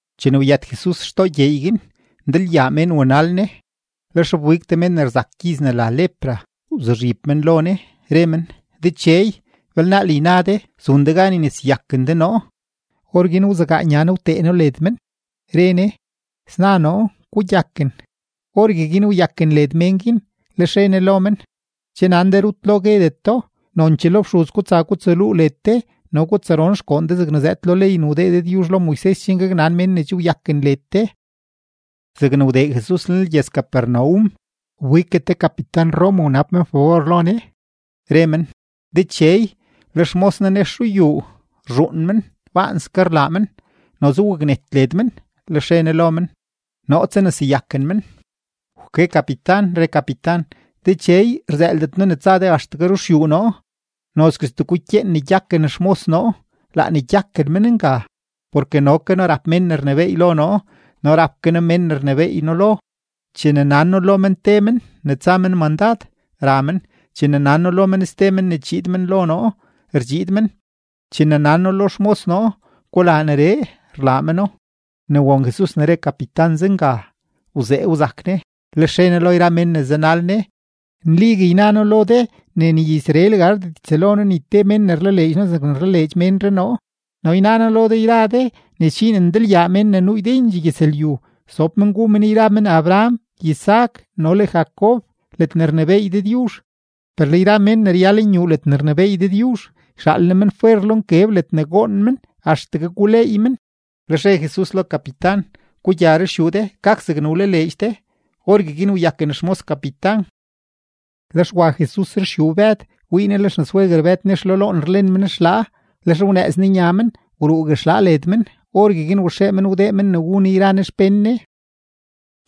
Chene wyët Jesus xtoo gyeey guin, ndalyaa mén wanal Ne. Lex wbig te mén ne rzak gyiz ne la lepra, wzuzhib men lo Ne, re men: ―Dechey, belnaal yna de zun de gan yneseyaken de noo. Orguin wzegaa Ne nya Ne wtee No led men, re Ne: ―Sna noo. Gugyaken. Orgueguin wyaken led mén guin. Lex re Ne lo men: ―Che nan de rut lo guedet do, nonchee lo fxuz gutsa gutsaluu led de no gutsaron xgoon de zegne zëëd lo ley ne wdee Dëdyuzh lo Moises chen gaknan mén ne che wyaken led de. Zegne wdee Jesus lenlgyëz-Capernaum, wbiggue te kapitan-Roma wnab men fabor lo Ne, re men: ―Dechey, le xmos noo nex ruyuu rzhuun men, baanske rlaa men, noze waknet led men. Lex re Ne lo men: ―Noo tsaneseyaken men. Wke kapitan, re kapitan: ―Dechey, rzëëldet noo ne tsa de axtegue ruxyuu noo; nozguestee gukyeen ne gyaken xmos noo, laa ne gyaken men nga. Porke no ke noo rap mén ne rnebééy lo noo, no rap ke noo mén ne rnebééy noo lo. Chene nan noo lo men te men ne tsa men mandad, ra men; chene nan noo lo men ste men ne chiid men lo noo, rdxiid men; chene nan noo lo xmos noo: “Gulaa neree”, rlaa meno. Ne won Jesus ne re kapitan zenga, wzee wzak Ne, lex re Ne lo yra mén ne zanal Ne: ―Nligue yna noo lo de ne ni Israel gardet ytsëlo noo ni te mén ne rlaleedx noo zegne rlaleedx ménree noo. No yna noo lo de yra de ne sdxiin ndalyaa mén ne nuu ydendxee gyëzlyu sob men gu men yra men Abraham, Isaac, no le Jacob ledne rnebééy Dëdyuzh. Per le yra mén ne ryal nyuu ledne rnebééy Dëdyuzh, yxaal Ne men fwer lo nkeb ledne goon men axtegue guleey men. Lex re Jesus lo kapitan: ―Gugya ruxyuu de; gak zegne wlaleedx de. Orgueguin wyaken xmos kapitan. Lex wa Jesus ruxyuu Bëd, wii Ne le xnasweguer Bëd nex lo loon rlen men xlaa. Lex wnëëz Ne nya men, wruugue xlaa led men; orgueguin waxee men wdee men ne wu Ne yra Ne xpén Ne.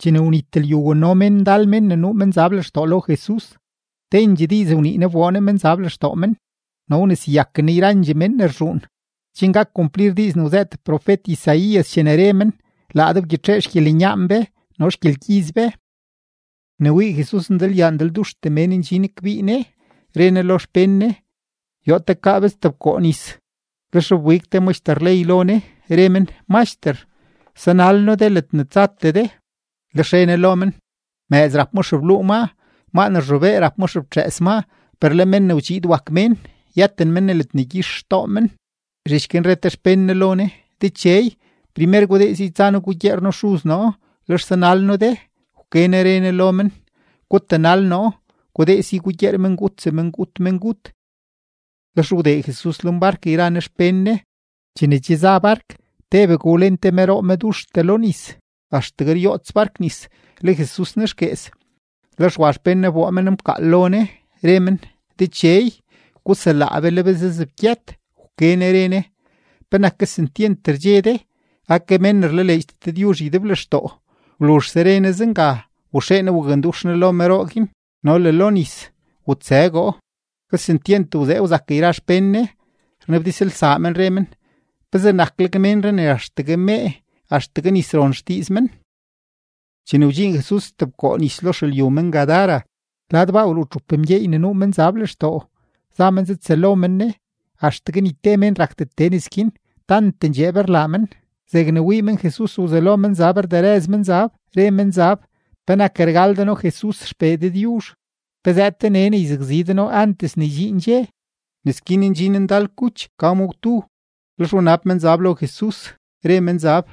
Chene wnit lyu, wano mén ndal mén ne nuu menzab lextoo lo Jesus, tendxee diiz wnii Ne wboo Ne menzab lextoo men, no wneseyaken Ne yrandxee mén ne rzhuun, chen gak kumplir diiz ne wzëët profet-Isaías chene re men: “Laa Ne wgyitxee xgyelenyaan be no le xgyelgyiz be.” Ne wii Jesus ne ndalyaa ndalduxtee mén ndxin kbii Ne, re Ne lo xpén Ne: “Yoo tekaa be stebkoo nis.” Lex wbig te maxter ley lo Ne, re men: ―Maxter, sanal noo de ledne tsatee de. Lex re Ne lo men: ―Mëëz rap ma xebluu maa, maa ne rzhobee rap ma xeftxëës maa; per le Men ne wdxiid wak Mén, yëten men ni ledne gyix xtoo men. Zhich guin re te xpén Ne lo Ne: ―Dechey, primer gudee si tsa noo gugyeer noo xuz noo, lex sanal noo de. Wke Ne re Ne lo men: ―Gutanal noo; gudee si gugyeer mengut semengut mengut. Lex wdee Jesus lenbark yra Ne xpén Ne. Chene che za bark, tebegue wlen te meroo meduxtee lo nis, axtegue ryoots bark nis; le Jesus nexguees. Lex wa xpén Ne wboo men mkaal lo Ne, re men: ―¡Dechey, guselaa be! ¡Le be zazebgyët! Wke Ne re Ne: ―¿Penak kesentyent rdxe de? ¡Ake mén ne rlaleedxdet Dëdyuzh ydeblextoo! Wluzhse re Ne zenga, waxee Ne wakndux Ne lo meroo guin no le lo nis; wutsëgoo. Kesentyent wzee wzak yra xpén Ne, rnabdizlsaa men, re men: ―¿Pezee nakleg ménree ne axtegue mee, axtegue nis ron xdiiz men? Chene wdxiin Jesus stebkoo nis lo xelyu men-Gadara, lad baa wruu txup mgyeey ne nuu menzab lextoo, za men zatsëlo men Ne. Axtegue ni te mén rakdet tee nes guin, tant ndxeeb rlaa men. Zegne wii men Jesus, wzelo menzab rderëz menzab, re menzab: ―¿Penak rgal de noo, Jesus XPee Dëdyuzh? ¿Pe zëëd de nee ne yzakzi de noo antes ne ydxiin dxe? Nes guin ndxin ndal kuch ka ma gwdu. Lex wnab menzab lo Jesus, re menzab: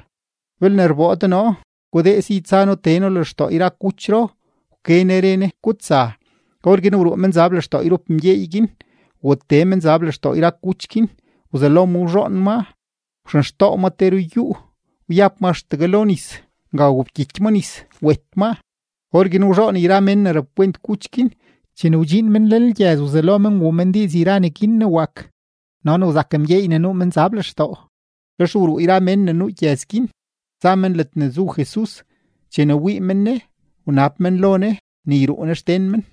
―Belne rboo de noo, gudee si tsa noo tee noo lextoo yra kuchro. Wke Ne re Ne: ―¡Gutsa! Orguin wruu menzab lextoo yrup mgyeey guin, watee menzab lextoo yra kuch guin. Wzelo ma wzhoon maa wxenxtoo maa te ruyúú, wyab ma axtegue lo nis. Nga wobkyiky ma nis, wet maa. Orguin wzhoon yra mén ne rapkwent kuch guin; chene wdxiin men lenlgyëz, wzelo men wuu men diiz yra neguin ne wak no ne wzak mgyeey ne nuu menzab lextoo. Lex wruu yrandxee mén ne nuu gyëz guin za men ledne zu Jesus. Chene wii men Ne, wnab men lo Ne ne yruu Ne xden men.